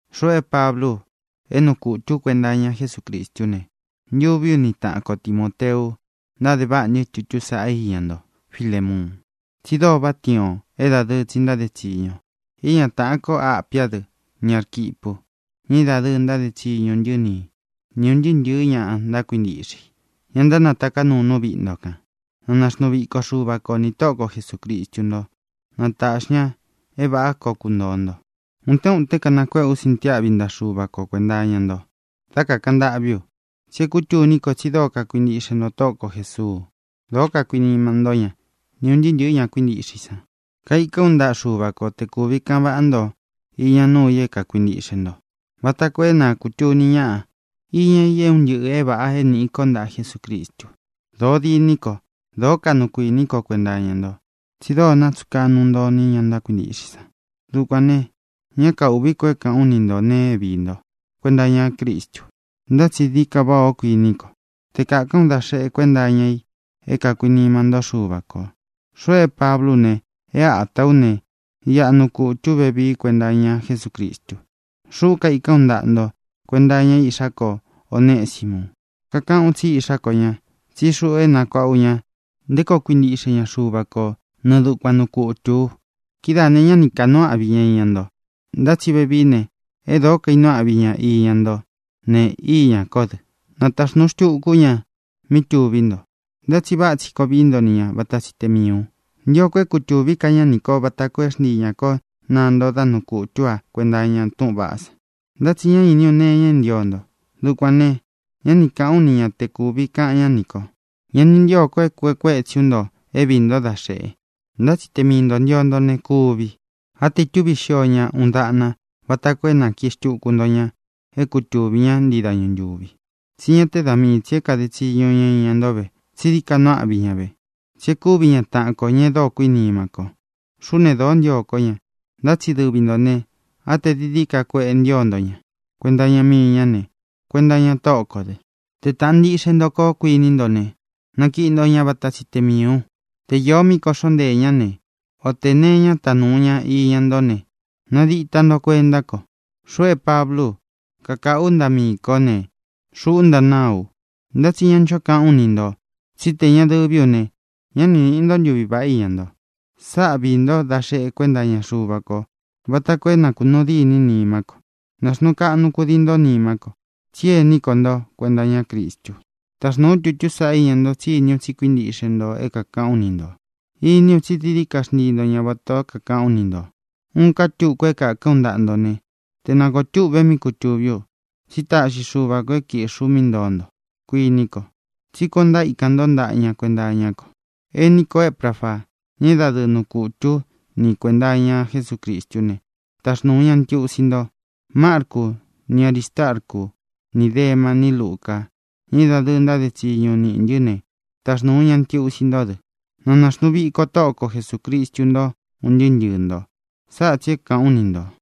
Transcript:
Xuꞌu é Pablú u, é nuu kutū ú kuenta iña Jesúcristú ne, ntuví u ni taꞌan ko Timōteu ntáde váꞌa ntɨ́ tutú sāꞌá iña nto, Filémuun, tsi dóo váꞌa tiin ō é dadɨɨ tsi ntáde tsiñu ō. Iña taꞌan ko Ápia dɨ, ni Ārquipu, ña é dadɨɨ ntáde tsiñu niꞌī ntɨ́, ni ūn ntɨɨ́ ntɨ̄ɨ́ ña kuíntiꞌxe i, ña ntánataká nuu nú viꞌi nto kān. Na naxnuu viko Xuva ko nī Tóꞌo ko Jesūcristu nto; na tāꞌxi ña é vāꞌá koo kuntōo nto. Utén utén kanakuéꞌe ú sintiáꞌvi ntaꞌa Xuva ko kuēnta iña nto dá kākaꞌan ntâꞌví u. Tsi é kūtuní ko tsi dóo kakuintiꞌxe nto Tóꞌo ko Jēsuu, dóo kakuinima ntó ña, ni ūn ntɨɨ́ ntɨ̄ɨ́ ña kuíntiꞌxe i san. Kaikán u ntaꞌa Xuva ko te kūvi kaꞌan váꞌa nto iña nuu i é kākuintiꞌxe nto, vata koo é na kūtuni ñáꞌa iña i é un ntɨꞌɨ̄ é vāꞌa é nīꞌi ko ntaꞌa Jesúcristu. Dōó diní ko, dōó kaꞌnu kuiní ko kuenta iña nto, tsi dóo kakuinima nto, tsi dóo nátsuꞌun kaꞌnu nto ini ña ntákuintiꞌxe i san. Dukuān ne, ñá kaūꞌví ko é kāꞌán u ni nto nēe é viī ntó kuenta iñá Cristu. Ntá tsi dií ka váꞌā ó, kuiní ko, te kākán u da xeꞌe kuenta iña i é kākuinima ntó Xuva kō. Xuꞌu é Pablú u ne, é atā ú ne, iꞌa nuu kutū ú vevii kuenta iña Jesúcristu. Xuꞌú kaikán u ntaꞌa nto kuenta iña iꞌxá ko Onesimu. Kakaꞌán u tsí iꞌxá ko ña, tsí xuꞌu é nakuāꞌá u ña nté koo kuintiꞌxe ña Xuva ko nɨɨ dukuan nuu kutū u. Kidáā ne, ñá ni kānuu áꞌvi ña iña ntó, ntá tsi vevií ne, e dóo kainuu áꞌvi ña iña ntó ne, iñá ko dɨ. Nataxnūu xtuku ú ña mí tuví nto. Ntá tsi váꞌa tsi koo vií nto ni ña vata tsi te miī u. Ntio ko é kūtuví ka ñá nī kó vata koo é xntii ñā kó naa nto dá nuu kutū ú a kuenta iña túꞌūn vaꞌá san. Ntá tsi ña iní u nee iña é ntio nto. Dukuān ne, ñá ni kāꞌán u ni ña te kutūví ka ña nī ko. Ña ni ntíō ko é kuēꞌe kuetsí u nto é viī ntó da xeꞌe, ntá tsi te mii ntō ntio nto ne, kuvi. Á te ītúvi xio ña uun daꞌna vata koo é nākiꞌi xtuku nto ña é kutuvī ñá ntii dañu ntūvi. Tsi ñá te da mii tsī é kāde tsiñu ña iña nto ve, tsí dií ka nuu áꞌvi ña ve, tsí e kúvi ña taꞌan kō, ña e dóo kuinima ko. Xuꞌú ne, dōó ntio kó ña. Ntá tsi dɨvi ntō ne, á tē dií dií ka kueꞌe ntío nto ña kuenta iña mii ñá ne, kuenta iña Tóꞌo kō dɨ. Te tāꞌan ntiꞌxe nto kó kuiní nto ne, nakiꞌi nto ña vata tsi te miī u. Te īo míꞌī é kōꞌxó nteē ñá, o te nēe iña é ītá nuu ña iña ntó ne, nadita nto kuentá ko. Xuꞌu é Pablú u kakaꞌū ú ntaꞌa miī kó ne: Xuꞌú ntanáa u. Ntá tsi ña ncho kaꞌán u ni ntō tsí tē ña dɨví u ne, ñá ni nīꞌi nto ntuví vaꞌá iña nto. Sáꞌa viī ntó da xeꞌe kuenta iña Xuva ko vata koo é na kūnuu dîní nimá ko. Nāxnuu kaꞌnu kudii ntó nimá ko, tsí ení ko nto kuenta iñá Cristu. Taxnūu ú tutú sāꞌá iña nto, tsí iní u tsí kuintiꞌxe nto é kākaꞌán u ni ntō. Iní u tsi dií dií ka xntíi nto ña vatā o é kākaꞌán u ni ntō. Uun ká tuku é kākán u ntaꞌa nto ne, te na kōo túꞌve míꞌi kutūví u. Tsi táꞌxi Xuva kō é kīꞌxí u mí ntoo nto, kuiní ko, tsí kuān o ntaíkan ntó ntaꞌa ña kuenta iñá ko. Ení ko Ēprafa, ña é dadɨɨ nuu kutū ú ni i kuēnta iña Jesúcristú ne, taxnūu ña ntiusi nto. Marcu, ni Arístarcu, ni Dema, ni Luca, ña é dadɨɨ ntáde tsiñu niꞌī ntɨ́ ne, taxnūu ña ntiusi ntó dɨ. Na nāxnuu viko Tóꞌo ko Jesūcristu ntó un ntɨɨ́ ntɨɨ̄ nto. Sáꞌa tsī é kāꞌán u ni ntō.